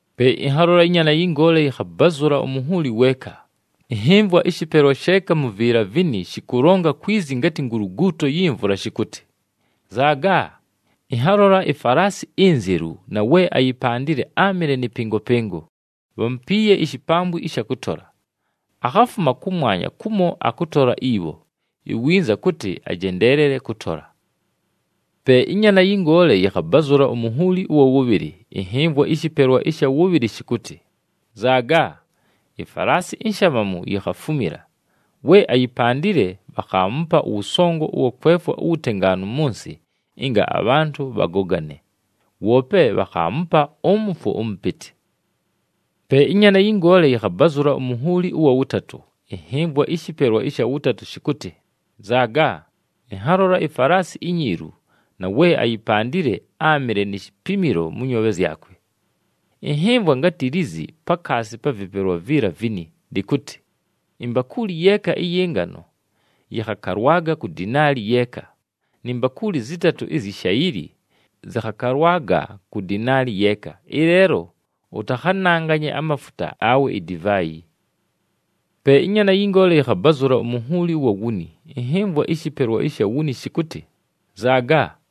Pe ɨnhalola ɨNyaana yɨ Ngoole yɨkhabazʉla umunhuuli weeka. Ɨnhɨmvwa ɨshɨpelwa sheeka mu viila vini shɨkʉlonga kwi zi ngatɨ nguluguuto yi mvula shɨkʉtɨ, “Nzaaga!” Ɨnhalola ifalaasi inzelu na we ayipandile áamɨle nɨ pɨngopɨngo, bhamupiiye ishipambwi ɨsha kʉtola. Akhafuma kʉmwanya kumo akʉtola ibho, iwinza kʉtɨ ajendeelele kʉtola. Pe ɨNyaana yɨ Ngoole yɨkhabazʉla umunhuuli ʉwa wʉbhɨlɨ, ɨnhɨmvwa ɨshɨpelwa ɨsha wʉbhɨlɨ shɨkʉtɨ, “Nzaaga!” Ifalaasi inshamamu yikhafumila. We ayipandile, bhakhaamupa ʉwʉsongo ʉwa kwefwa uwutengaanu mʉ nsɨ ɨnga abhantʉ bhagogane, woope bhakhaamupa ʉmʉfwo ʉmʉpɨtɨ. Pe ɨNyaana yɨ Ngoole yɨkhabazʉla umunhuuli ʉwa wʉtatʉ, ɨnhɨmvwa ɨshɨpelwa ɨsha wʉtatʉ shɨkʉtɨ, “Nzaaga!” Ɨnhalola ifalaasi inyiilu, na we ayipandile áamɨle ni shipimilo mʉ nyoobhe zyakwe. Ɨnhɨmvwa ngatɨ lizi pakaasi pa vɨpelwa viila vini, lɨkʉtɨ, “Imbakuuli yeeka ɨyɨ ngano yɨkhakalwaga ku dinaali yeeka, ni mbakuuli zɨtatʉ izyi shayili zɨkhakalwaga ku dinaali yeeka, ɨleelo ʉtakhananganye amafuta awe idivaayi.” Pe ɨNyaana yɨ Ngoole yɨkhabazʉla umunhuuli ʉwa wuni, ɨnhɨmvwa ɨshɨpelwa ɨsha wuni shɨkʉtɨ, “Nzaaga!”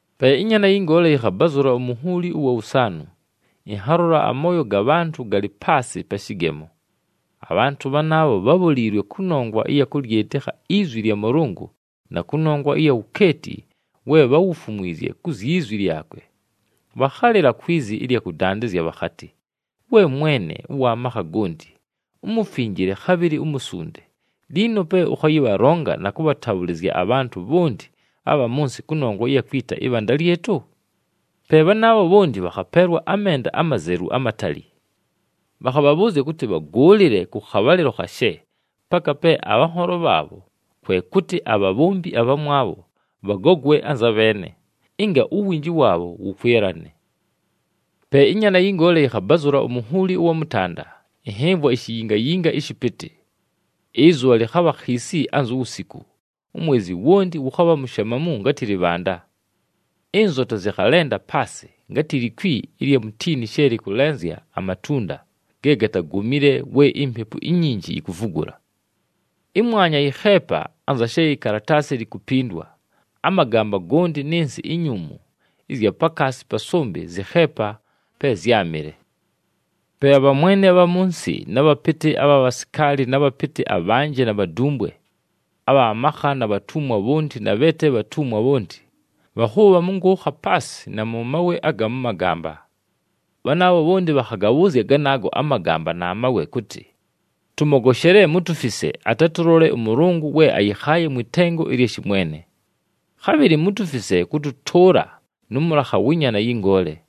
Pe ɨNyaana yɨ Ngoole yɨkhabazʉla umunhuuli ʉwa wʉsaanʉ, ɨnhalola amooyo ga bhantʉ galɨ paasɨ pa shɨgemo. Abhantʉ bhanaabho bhábholiilwe kʉnongwa ɨya kʉlyɨtɨkha izwi lya Mʉlʉngʉ na kʉnongwa ɨya wukeeti we bháwufumwizye ku zyi zwi lyakwe. Bhakhalɨla kwi zi ɨlya kʉdandɨzya bhakhatɨ, “We Mwene ʉwa makha gonti, uMufinjile, khabhɨlɨ uMusunde, liino pe ʉkhayɨbhalonga na kʉbhatabhʉlɨzya abhantʉ bhonti abha mʉ nsɨ kʉnongwa ɨya kwita ɨbhanda lyɨtʉ?” Pe bhanaabho bhonti, bhakhapeelwa amenda amazelu amatali. Bhakhabhabhʉʉzya kʉtɨ bhagʉʉlɨle kʉ khabhalɨlo khashe, paka pe abhanholo bhaabho, kwe kʉtɨ abhabhombi abhamwabho, bhagogwe anza bheene, ɨnga uwinji waabho wʉkwɨlane. Pe ɨNyaana yɨ Ngoole yɨkhabazʉla umunhuuli ʉwa mʉtanda, ɨnhɨmvwa ishiyingayinga ɨshɨpɨtɨ. Ɨzʉbha lɨkhabha khiisi anzu wusiku, umwezi wonti wʉkhabha mushamamu ngatɨ lɨbhanda. Ɨnzota zɨkhalenda paasɨ, ngatɨ likwi ɨlya mutiini she lɨkʉlenzya amatunda ge gatagomile we impepu inyinji yikuvugula. Ɨmwanya yɨkheepa, anza she ikalataasi likupindwa, amagamba gonti nɨ nsɨ inyuumu ɨzya pakaasi pa sʉmbɨ zɨkheepa pe zyámɨle. Pe abhamwene abha mʉ nsɨ na bhapɨtɨ abha bhasikaali na bhapɨtɨ abhanjɨ na bhadumbwe, abha makha na bhatumwa bhonti na bhe te bhatumwa bhonti, bhakhʉʉbha mʉ nkʉʉkha paasɨ na mʉ mawe aga mʉ magamba. Bhanaabho bhonti bhakhagabhʉʉzya ganaago amagamba na mawe, kʉtɨ, “Tʉmogoshele! Mutufise, atatʉlole ʉMʉlʉngʉ we ayɨkhaaye mwɨ tengo ɨlya shɨmwene. Khabhɨlɨ mutufise kʉtʉtʉʉla nʉ mʉlakha wɨ Nyaana yɨ Ngoole.